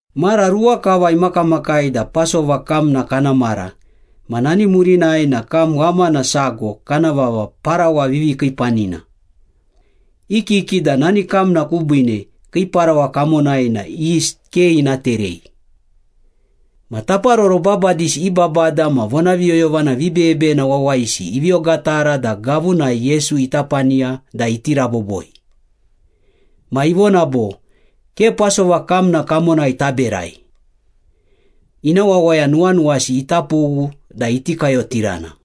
Mara ruwa kava imakamakai da Pasova kamna kana mara ma nani murinai na kam ghamana sago kana vava ‘Parawa Vivikiipanina.’ I kiki da nani kamna kubiine kii parawa kamonai na yist ke ina terei. Ma taparoro babadisi i babada ma vonaviyoyovana vibeyebeyena wawayisi ivi ogatara da gavunai Yesu ita paniya da iti raboboi. Ma ivona bo, “Ke Pasova kamna kamonai taberai. Ina wawaya nuwanuwasi ita pughu da iti kayotirana.”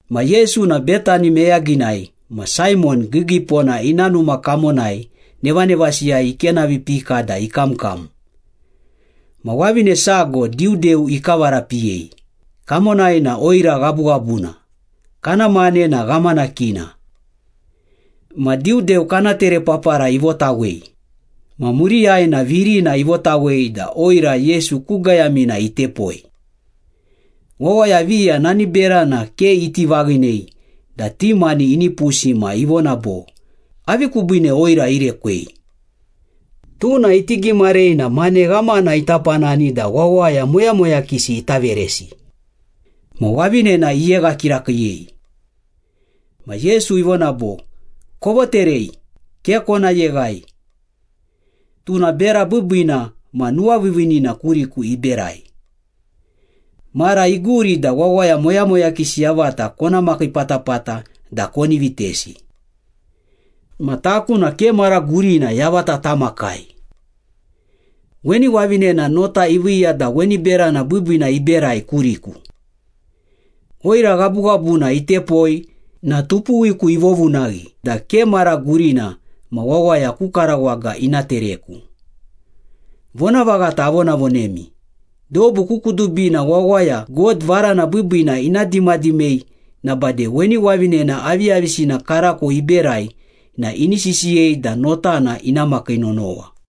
Ma Yesu na Betani meyaginai ma Saimon Giigiipona ina numa kamonai nevanevasiyai ikenavipika da ikamkam. Ma wavine sago diudeu ikavarapiyei, kamonai na oira ghabughabuna, kana mane na ghamanakina. Ma diudeu kana terepapara ivotawei, ma muriyai na virina ivotawei da oira Yesu ku gayamina itepoi. Wawaya viya nani berana ke iti vaghinei da ti mani inipusi ma ivona bo, “Avi kubiine oira irekwei? Tuna iti gimarei na mane ghamana ita panani da wawaya moyamoyakisi ita veresi.” Ma wavinena iyegha kirakiiyei. Ma Yesu ivona bo, “Kovoterei, ke kona yeghai. Tuna bera biibiina ma nuwaviiviinina kuriku iberai. Mara iguri da wawaya moyamoyakisi yavata kona makii patapata da koni vitesi. Ma taku na ke mara gurina yavata tamakai. Weni wavinena nota iviiya da weni berana biibiina iberai kuriku. Oira ghabughabuna itepoi na tupuwiku ivovunaghi da ke mara gurina ma wawaya ku karawaga ina tereku. Vonavaghata avonavonemi, dobu ku kudubina wawaya God varana biibiina ina dimadimei na bade weni wavinena aviyavisina karako iberai na ini sisiyei da notana ina makii nonowa.”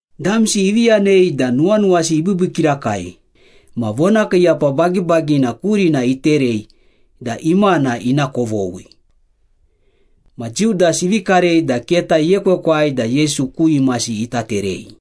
Damsi ivi yanei da nuwanuwasi ibiibii kirakai ma vonakiiyapa bagibagina kurina iterei da imana ina kovoghi. Ma Judas ivi karei da keta iekwekwai da Yesu ku imasi ita terei.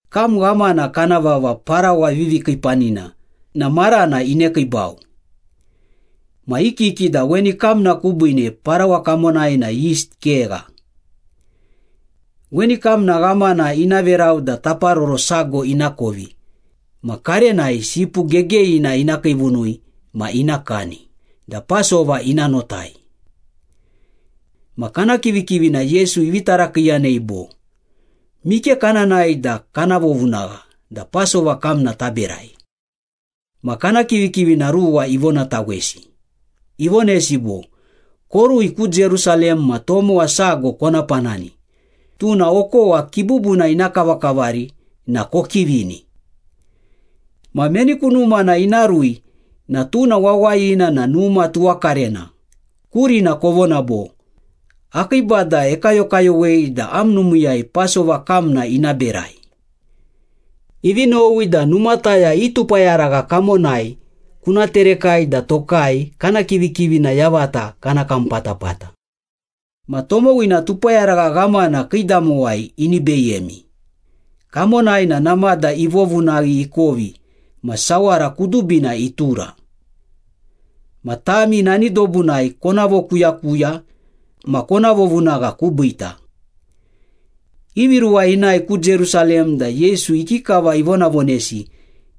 Kam ghamana kana vava ‘Parawa Vivikiipanina’ na marana inekiibau. Ma i kiki da weni kamna kubiine parawa kamonai na yist kegha. Weni kamna ghamana ina verau da taparoro sago ina kovi ma karenai sipu gegeyina ina kiivunui ma ina kani da Pasova ina notai. Ma kana kivikivina Yesu ivi tarakiiyanei bo, “Mike kana nae da kana vovunagha da Pasova kamna taberai?” Ma kana kivikivina ruwa ivonatawesi, ivonesi bo, “Korui ku Jerusalem ma tomowa sago kona panani, tuna okowa kibubuna ina kavakavari na kokivini. Ma meni ku numana ina rui na tuna wawayina na numa tuwakarena kurina kovona bo, ‘Akii Bada ekayokayowei da am numiiyai Pasova kamna ina berai. Ivi nowi da numataya i tupayaragha kamonai kuna terekai da tokai kana kivikivina yavata kana kam patapata.’ Ma tomowina tupayaragha ghamana kiidamowai ini beyemi, kamonai na namada ivovunaghi ikovi ma sawara kudubina itura. Ma tami nani dobunai kona vokuyakuya ma kona vovunagha kubiita.” Ivi ruwa inae ku Jerusalem da Yesu ikikava ivonavonesi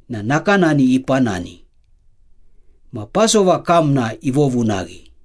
na nakanani ipanani. Ma Pasova kamna ivovunaghi.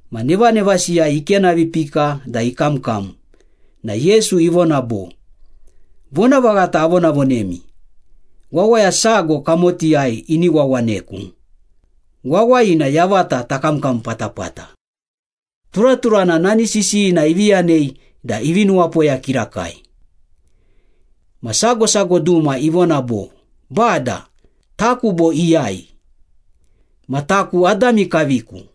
Ma nevanevasiyai ikenavipika da ikamkam na Yesu ivona bo, “Vonavaghata avonavonemi, wawaya sago kamotiyai ini wawaneku, wawayina yavata takamkam patapata.” Turaturana nani sisiyina ivi yanei da ivi nuwapoya kirakai. Ma sago sago duma ivona bo, “Bada, taku bo iyai? Ma taku adami kaviku.”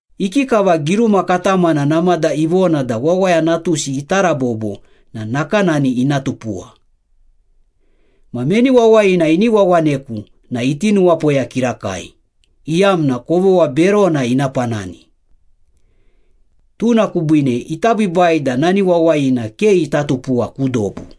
Ikikava giruma katamana namada ivona da Wawaya Natusi ita rabobo na nakanani ina tupuwa. Ma meni wawayina ini wawaneku na iti nuwapoya kirakai, iyamna kovogha berona ina panani. Tuna kubiine ita biibai da nani wawayina ke ita tupuwa ku dobu.”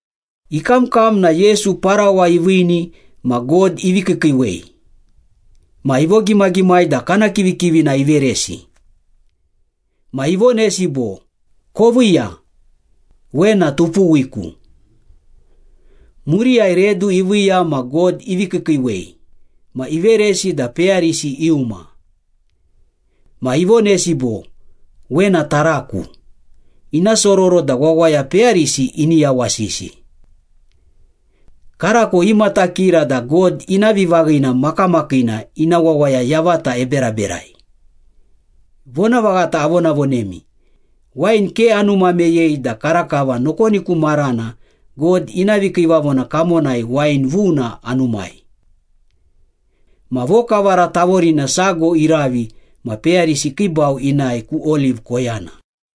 Ikamkam na Yesu parawa iviini ma God ivi kiikiiwei, ma ivogimagimai da kana kivikivina iveresi. Ma ivonesi bo, “Koviiya, wena tupuwiku.” Muriyai redu iviiya ma God ivi kiikiiwei, ma iveresi da peyarisi iuma. Ma ivonesi bo, “Wena taraku, ina sororo da wawaya peyarisi ini yawasisi. Karako imatakira da God ina vivaghina makamakiina ina wawaya yavata eberaberai. Vonavaghata avonavonemi, wain ke anuma meyei da karakava nokoni ku marana God ina vikiivavona kamonai wain vuna anumai.” Ma vokavara tavorina sago iravi ma peyarisi ikiibau inae ku Oliv koyana.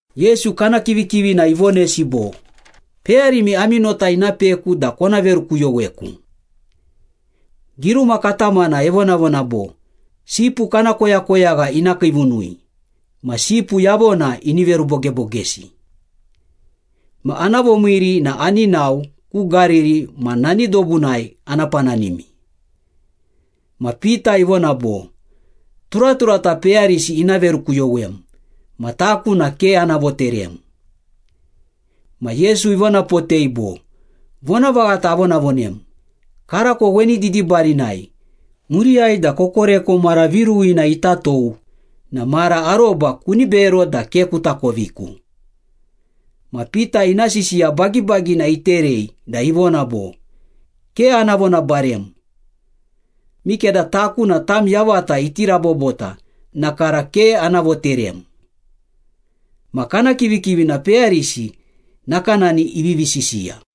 Yesu kana kivikivina ivonesi bo, “Peyarimi ami nota ina peku da kona verukuyoweku. Giruma katamana evonavona bo, ‘Sipu kana koyakoyagha ina kiivunui, ma sipu yavona ini verubogebogesi.’ Ma ana vomiiri na ani nao ku Gariri ma nani dobunai ana pananimi.” Ma Pita ivona bo, “Turaturata peyarisi ina verukuyowem ma taku na ke ana voterem.” Ma Yesu ivonapotei bo, “Vonavaghata avonavonem, karako weni didibarinai, muriyai da kokoreko mara viruwina ita tou na mara aroba kuni bero da ke kuta koviku.” Ma Pita ina sisiya bagibagina iterei da ivona bo, “Ke ana vonabarem! Mikeda taku na tam yavata iti rabobota na kara ke ana voterem.” Ma kana kivikivina peyarisi nakanani ivivi sisiya.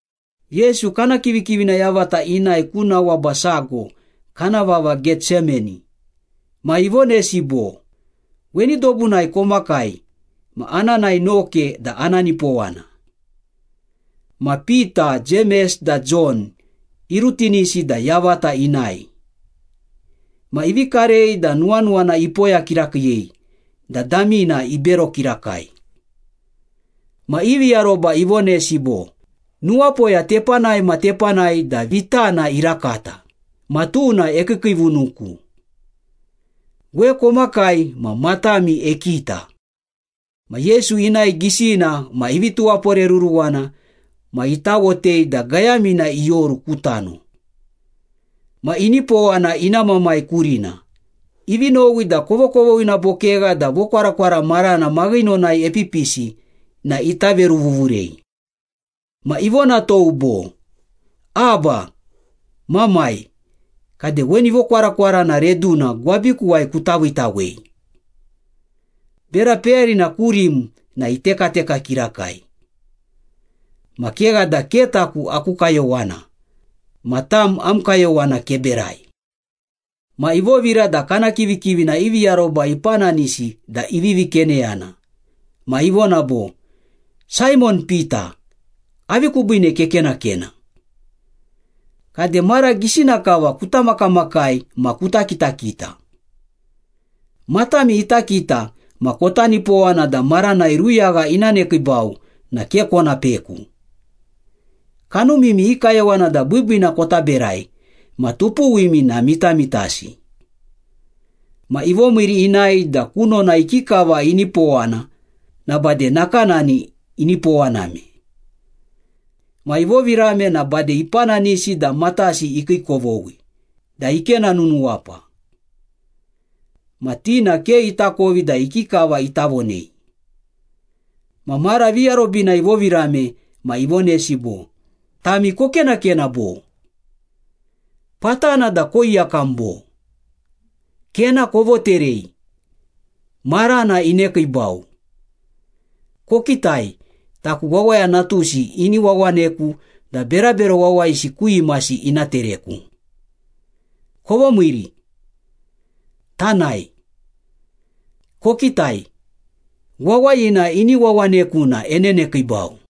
Yesu kana kivikivina yavata inae ku nawaba sago kana vava Getsemani, ma ivonesi bo, “Weni dobunai komakai ma ana nae noke da ana nipowana.” Ma Pita, Jemes da Jon irutinisi da yavata inae. Ma ivi karei da nuwanuwana ipoya kirakiiyei da damina ibero kirakai. Ma ivi aroba ivonesi bo, “Nuwapoya tepanai ma tepanai da vitana irakata, ma tuna ekiikiivunuku. We komakai ma matami ekita.” Ma Yesu inae gisina ma ivi tuwaporeruruwana ma itawotei da gayamina ioru ku tano. Ma inipowana ina Mamai kurina, ivi nowi da kovokovoghina bo kegha da vokwarakwara marana maghinonai epipisi na ita veruvuvurei. Ma ivonatou bo, “Abba, Mamai, kade weni vokwarakwarana reduna gwabikuwai kuta viitawei. Bera peyarina kurim na itekateka kirakai. Ma kegha da ke taku aku kayowana, ma tam am kayowana keberai.” Ma ivovira da kana kivikivina ivi aroba ipananisi da ivivi keneyana ma ivona bo, “Saimon Pita, avi kubiine kekenakena? Kade mara gisina kava kuta makamakai ma kuta kitakita. Matami ita kita ma kota nipowana da maranai ruyagha ina nekiibau na ke kona peku. Kanumimi i kayowana da biibiina kota berai ma tupuwimi na mitamitasi.” Ma ivomiiri inae da kunona ikikava inipowana na bade nakanani inipowaname. Ma ivovirame na bade ipananisi da matasi ikiikovoghi da ikena nunuwapa. Ma ti na ke itakovi da ikikava ita vonei. Ma mara viarobina ivovirame ma ivonesi bo, “Tami kokenakena, bo? Patana da koiyakam, bo? Kena kovoterei. Marana inekiibau. Kokitai, taku Wawaya Natusi ini wawaneku da berabero wawayisi ku imasi ina tereku. Kovomiiri. Tanae. Kokitai, wawayina ini wawaneku na enenekiibau.”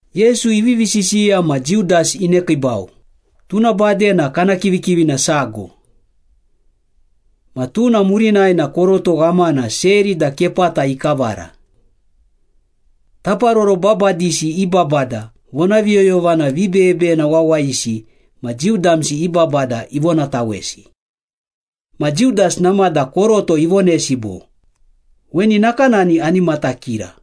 Yesu ivivi sisiya ma Judas inekiibau, tuna bade na kana kivikivina sago. Ma tuna murinai na koroto ghamana seri da kepata ikavara. Taparoro babadisi i babada, vonaviyoyovana vibeyebeyena wawayisi ma Jiu damsi i babada ivonatawesi. Ma Judas namada koroto ivonesi bo, “Weni nakanani ani matakira.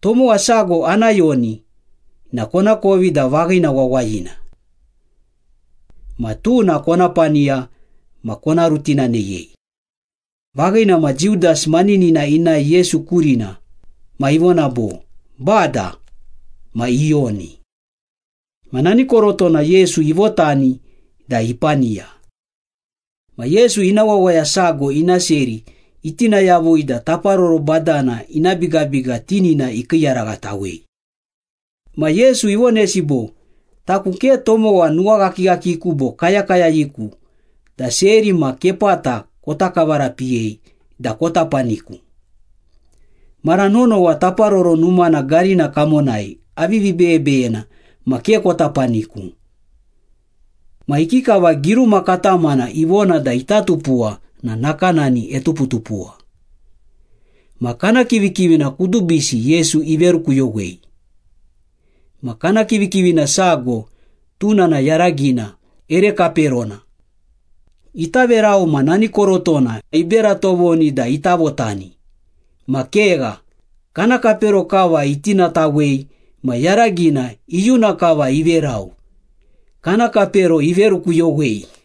Tomowa sago ana yoni na konakovi da vaghina wawayina. Ma tuna kona paniya ma kona rutinaneyei.” Vaghina ma Judas maninina inae Yesu kurina ma ivona bo, “Bada,” ma iyoni. Ma nani korotona Yesu ivotani da ipaniya. Ma Yesu ina wawaya sago ina seri itina yavui da taparoro badana ina bigabiga tinina ikiiyaraghatawei. Ma Yesu ivonesi bo, “Taku ke tomowa nuwaghakighakiku bo kayakayayiku da seri ma kepata kota kavarapiyei da kota paniku. Mara nonowa Taparoro Numana garina kamonai avivi beyebeyena ma ke kota paniku. Ma ikikava giruma katamana ivona da ita tupuwa na nakanani etuputupuwa.” Ma kana kivikivina kudubisi Yesu iverukuyowei. Ma kana kivikivina sago, tuna na yaragina ere kaperona. Ita verau ma nani korotona ibera tovoni da ita votani ma kegha, kana kapero kava itinatawei ma yaragina iyuna kava iverau, kana kapero iverukuyowei.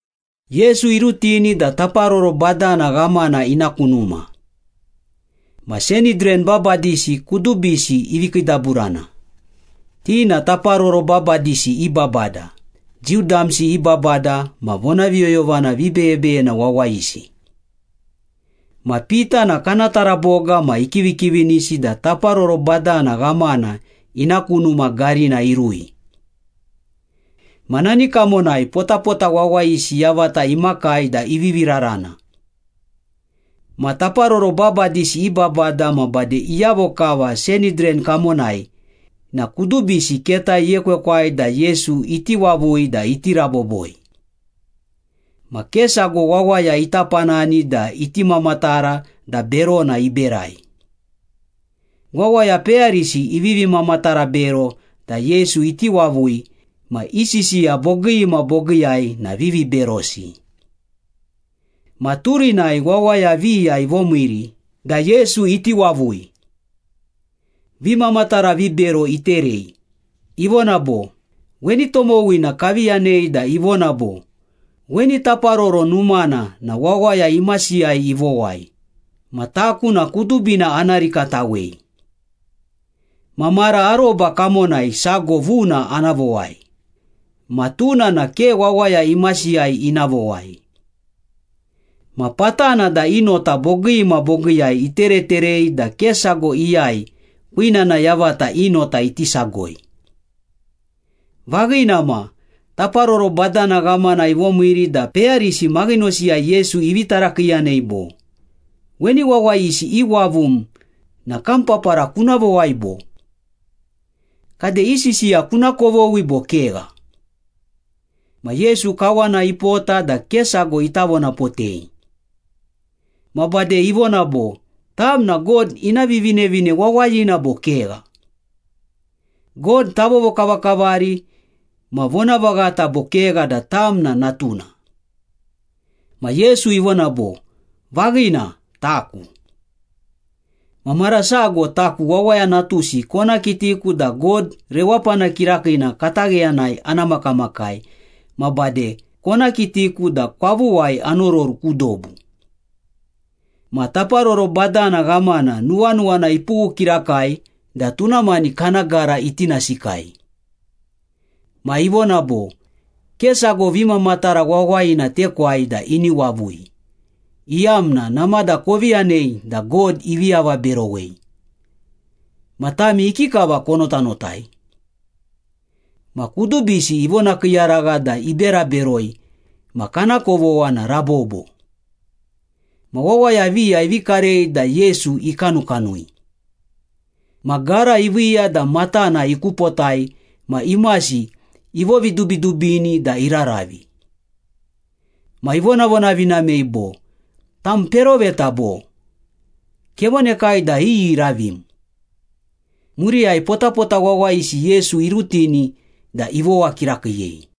Yesu irutini da taparoro badana ghamana ina ku numa. Ma Sanhidran babadisi kudubisi ivi kiidaburana, ti na taparoro babadisi i babada, Jiu damsi i babada ma vonaviyoyovana vibeyebeyena wawayisi. Ma Pita na kana taraboga ma ikivikivinisi da taparoro badana ghamana ina ku numa garina irui. Ma nani kamonai potapota wawayisi yavata imakai da ivivi rarana. Ma taparoro babadisi i babada ma bade iyavo kava Sanhidran kamonai na kudubisi keta iekwekwai da Yesu iti wavui da iti raboboi. Ma ke sago wawaya ita panani da iti mamatara da berona iberai. Wawaya peyarisi ivivi mamatara bero da Yesu iti wavui ma i sisiya bogii ma bogiiyai na viviberosi. Ma turinai wawaya viya ivomiiri da Yesu iti wavui. Vimamatara vibero iterei, ivona bo, “Weni tomowina kavi yanei da ivona bo, ‘Weni Taparoro Numana na wawaya imasiyai ivowai, ma taku na kudubina ana rikatawei. Ma mara aroba kamonai sago vuna ana vowai, ma tuna na ke wawaya imasiyai ina vowai.’” Ma patana da i nota bogii ma bogiiyai itereterei da ke sago iyai kwinana yavata i nota iti sagoi. Vaghina ma, taparoro badana ghamana ivomiiri da peyarisi maghinosiyai Yesu ivi tarakiiyanei bo, “Weni wawayisi iwavum na kam papara kuna vowai bo? Kade i sisiya kuna kovoghi bo kegha?” Ma Yesu kawana ipota da ke sago ita vonapotei. Ma bade ivona bo, “Tam na God ina Vivinevine Wawayina bo kegha? God tavovokavakavari ma vonavaghata bo kegha da tam na natuna?” Ma Yesu ivona bo, “Vaghina, taku. Ma mara sago taku Wawaya Natusi kona kitiku da God Rewapana Kirakiina katagheyanai ana makamakai ma bade kona kitiku da kwavuwai anororu ku dobu.” Ma taparoro badana ghamana nuwanuwana ipughu kirakai da tuna mani kana gara itinasikai. Ma ivona bo, “Ke sago vimamatara wawayina tekwai da ini wavui, iyamna namada kovi yanei da God ivi avaberowei. Ma tami ikikava konotanotai?” Ma kudubisi ivonakiiyaragha da ibera beroi ma kana kovogha na rabobo. Ma wawaya viya ivi karei da Yesu ikanukanui. Ma gara iviiya da matana ikupotai ma imasi ivovidubidubini da iraravi. Ma ivonavonavinamei bo, “Tam peroveta bo? Kevonekai da iyi iravim.” Muriyai potapota wawayisi Yesu irutini da ivowa kirakiiyei.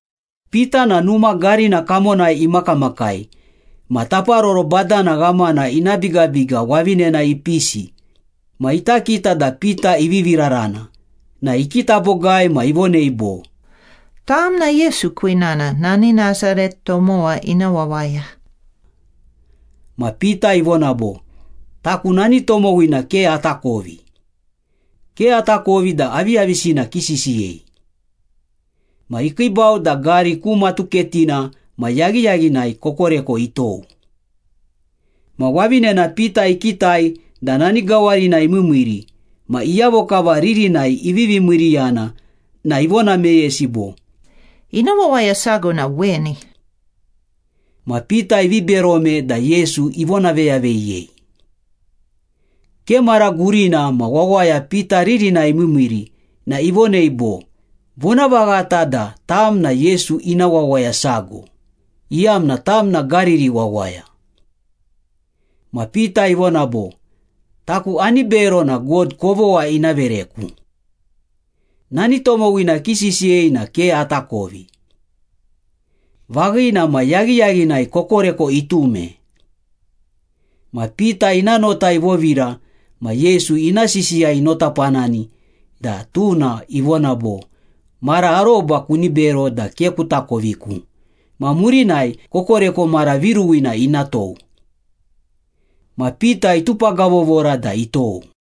Pita na numa garina kamonai imakamakai ma taparoro badana ghamana ina bigabiga wavinena ipisi ma ita kita da Pita ivivi rarana na ikita bogai ma ivonei bo, “Tam na Yesu kwinana, nani Nasaret tomowa ina wawaya.” Ma Pita ivona bo, “Taku nani tomowina ke atakovi. Ke atakovi da aviyavisina kisisiyei.” Ma ikiibau da gari ku matuketina ma yaghiyaghinai kokoreko itou. Ma wavinena Pita ikitai da nani gawarinai imiimiiri ma iyavo kava ririnai ivivi miiriyana na ivona meyesi bo, “Ina wawaya sago na weni.” Ma Pita ivi berome da Yesu ivonaveyaveyiyei. Ke mara gurina ma wawaya Pita ririnai imiimiiri na ivonei bo, “Vonavaghata da tam na Yesu ina wawaya sago, iyamna tam na Gariri wawaya.” Ma Pita ivona bo, “Taku ani bero na God kovogha ina vereku. Nani tomowina kisisiyei na ke atakovi.” Vaghina ma, yaghiyaghinai kokoreko itume. Ma Pita ina nota ivovira ma Yesu ina sisiya inotapanani da tuna ivona bo, “Mara aroba kuni bero da ke kutakoviku ma murinai kokoreko mara viruwina ina tou.” Ma Pita itupagavovora da itou.